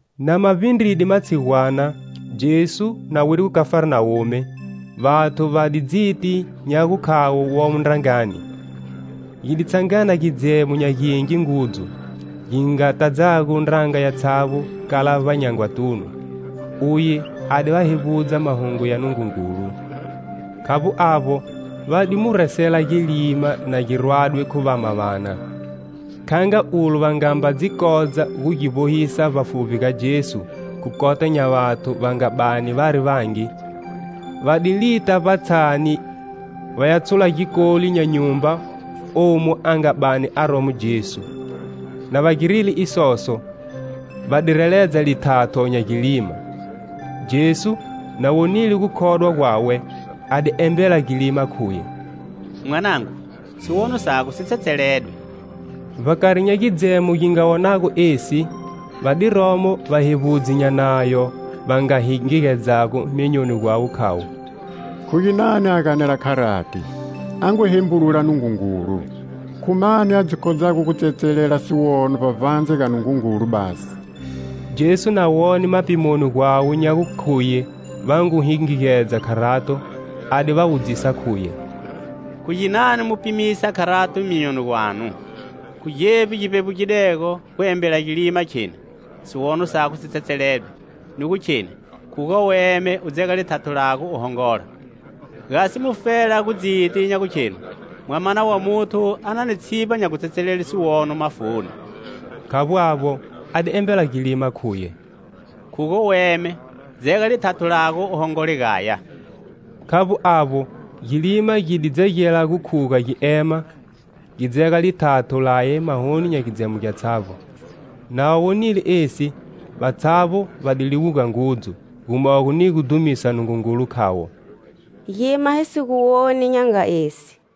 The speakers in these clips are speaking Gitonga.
Na ma vbindride matshigwana, Jesu, na wide Khafarnawume, vathu va di dziti nya gukhavo womo ndrangani. Gi di tshangana gidzemo nya gingi ngudzu, gi nga tadzago ndranga yatshavbo kala vbanyangwatunu. Uye a di va hevbudza Mahungu ya Nungungulu. Khavbo avbo, va di mu resela gilima na gi rwadwe khu vama vana. Kha nga ulo va ngamba dzi kodza gu gi vbohisa vbafuvbi ga Jesu, khu kota nya vathu va nga bani vari vangi, va di lita vbatshani vaya tshula gikoli nya nyumba omu a nga bani aromo Jesu; na va girile isoso, va di reledza lithatho nya gilima. Jesu, na wonile gukhodwa gwawe, a di embela gilima, khuye: "Mwanangu, siwono sago si tsetseledwe." Vbakari nya gidzemo gi nga wonago esi, va di romo vahevbudzi nya Nayo va nga hingigedzago myonyoni gwawe khavo: "Khu ginani a ganela kharati? A ngu hembulula Nungungulu. Khu mani a dzi kodzago gu tsetselela siwono vbavbandze ga Nungungulu basi?" Jesu na wone mapimoni gwawe nya gukhuye va ngu hingigedza kharato, a di va wudzisa khuye: "Khu ginani mu pimisa kharato myonyoni gwanu? Khu gevbi gi vbevbugidego, gu embela gilima, kheni: 'Siwono sago si tsetseledwe,' ni gu kheni: 'Khuga u eme, u dzega lithatho lago u hongola?' Gasi mufela gu dziti nya gukhenu Mwamana wa Muthu a na ni tshivba nya gutsetselele siwono mafuni." Khavbo avbo, a di embela gilima khuye: "Khuga u eme, dzega lithatho lago u hongole gaya." Khavbo avbo gilima gi di dzegela gu khuga gi ema gi dzega lithatho laye mahoni nya gidzemo gyatshavbo. Na va wonile esi, vatshavbo va di liwuga ngudzu, gumogo ni gu dhumisa Nungungulu, khavo: "Gima hi si gu woni nya nga esi."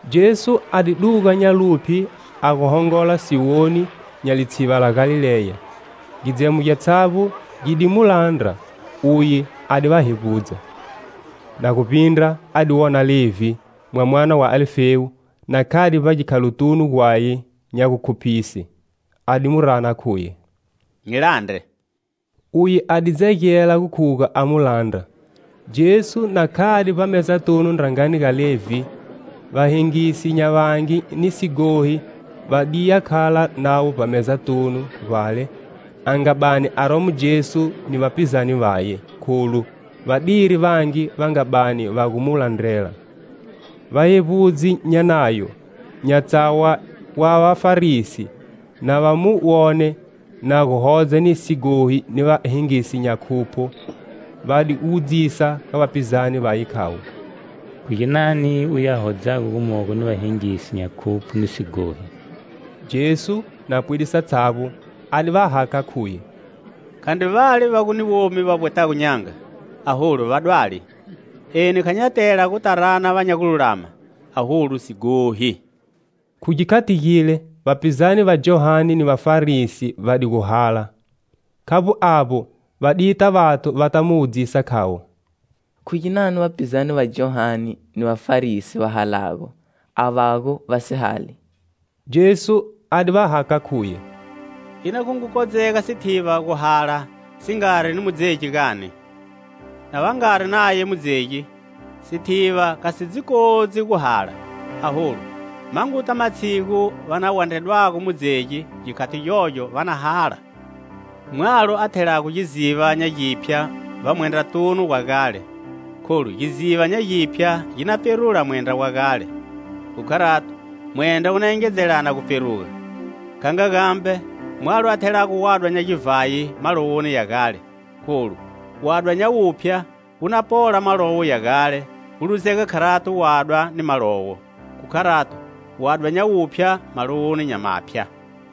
Jesu a di duga nya luphye a gu hongola siwoni nya litsiva la Galileya. Gidzemo gyatshavbo gi di mu landra; uye a di va hevbudza. Na gu vbindra a di wona Levhi, mwamana wa Alifewu, na khade vbagikhalotunu gwaye nya gukhuphise. A di mu rana, khuye: "Nyi landre." Uye a di dzegela gu khuga a mu landra. Jesu na khade vbamezatunu ndrangani ga Levhi, va hengisi nya vangi ni sighohi va di ya khala navo vbamezatunu vbale a nga bani aromo Jesu ni vapizane Vaye, kholu va diri vangi va nga bani va gu mu landrela. Vahevbudzi nya Nayo, nya tsawa wa Vafarisi, na va mu wone na gu hodza ni sighohi ni vahengisi nya khupho, va di wudzisa ga vapizane vaye khavo: "Khu ginani uye a hodzago gumogo ni vahengisi nya khupho ni sighohi?" Jesu, na pwide satshavbo, a di va hakha, khuye: "Khandri vale va gu ni womi va vbwetago n'yanga, aholu vadwali. Eni kha nya tela guta rana va nya gululama, aholu, sighohi." Khu gikhati gile, vapizane va Johane ni Vafarisi va di gu hala. Khavbo avbo va dita vathu va ta mu wudzisa khavo: "Khu ginani vapizane va Johane ni Vafarisi va halago, avo vago va si hali?" Jesu a di va hakha khuye: " Ina gu ngu kodzega sithiva gu hala si ngari ni mudzegi gani? Na va ngari naye mudzegi, sithiva kha si dzi kodzi gu hala. Aholu, ma nguta matshigu va na gu wandredwago mudzegi. Gikhati gyogyo va na hala. Mwalo a thelago giziva nya giphya vbamwendratunu wa gale kholu giziva nya giphya gi na pferula mwendra wa gale, khu kharato mwendra wu na engedzelana gu pferuga. Kha nga gambe mwalo a thelago wadwa nya givhayi malowoni ya gale, kholu wadwa nya wuphya wu na pola malowo ya gale, gu luzeka kharato wadwa ni malowo. Khu kharato; wadwa nya wuphya, malowoni nya maphya."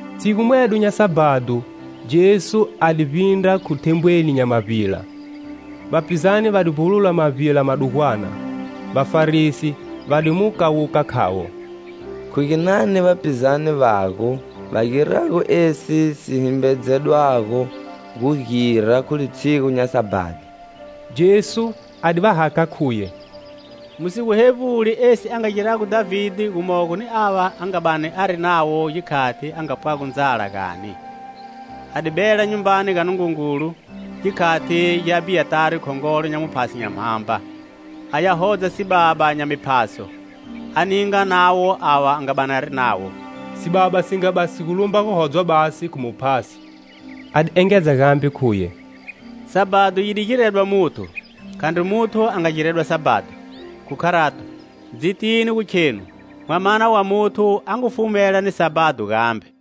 Tshigu mwedo nya Sabhado, Jesu a di vbindra khu thembweni nya mavbila. Vapizane va di vbulula mavbila madugwana. Vafarisi va di mu kawuka khavo: "Khu ginani vapizane vago va girago esi si himbedzedwago gu gira khu litshigu nya Sabhado?" Jesu a di va hakha khuye: "Mu si gu hevbuli esi a nga girago Dhavide gumogo ni ava a nga bani ari navo gikhati a nga pwago ndzala, gani? A di bela Nyumbani ga Nungungulu gikhati gya Abhiyatari, khongolo nya vaphasi nya mhamba, a ya hodza sibaba nya miphaso, a ninga navo ava a nga bani ari navo, sibaba si nga bani si gu lumba gu hodzwa basi khu muphasi." A di engedza gambe khuye: "Sabhado yi di giredwa muthu, khandri muthu a nga giredwa Sabhado. Khu kharato, dzitini gu khenu Mwamana wa Muthu a ngu fumela ni Sabhado gambe."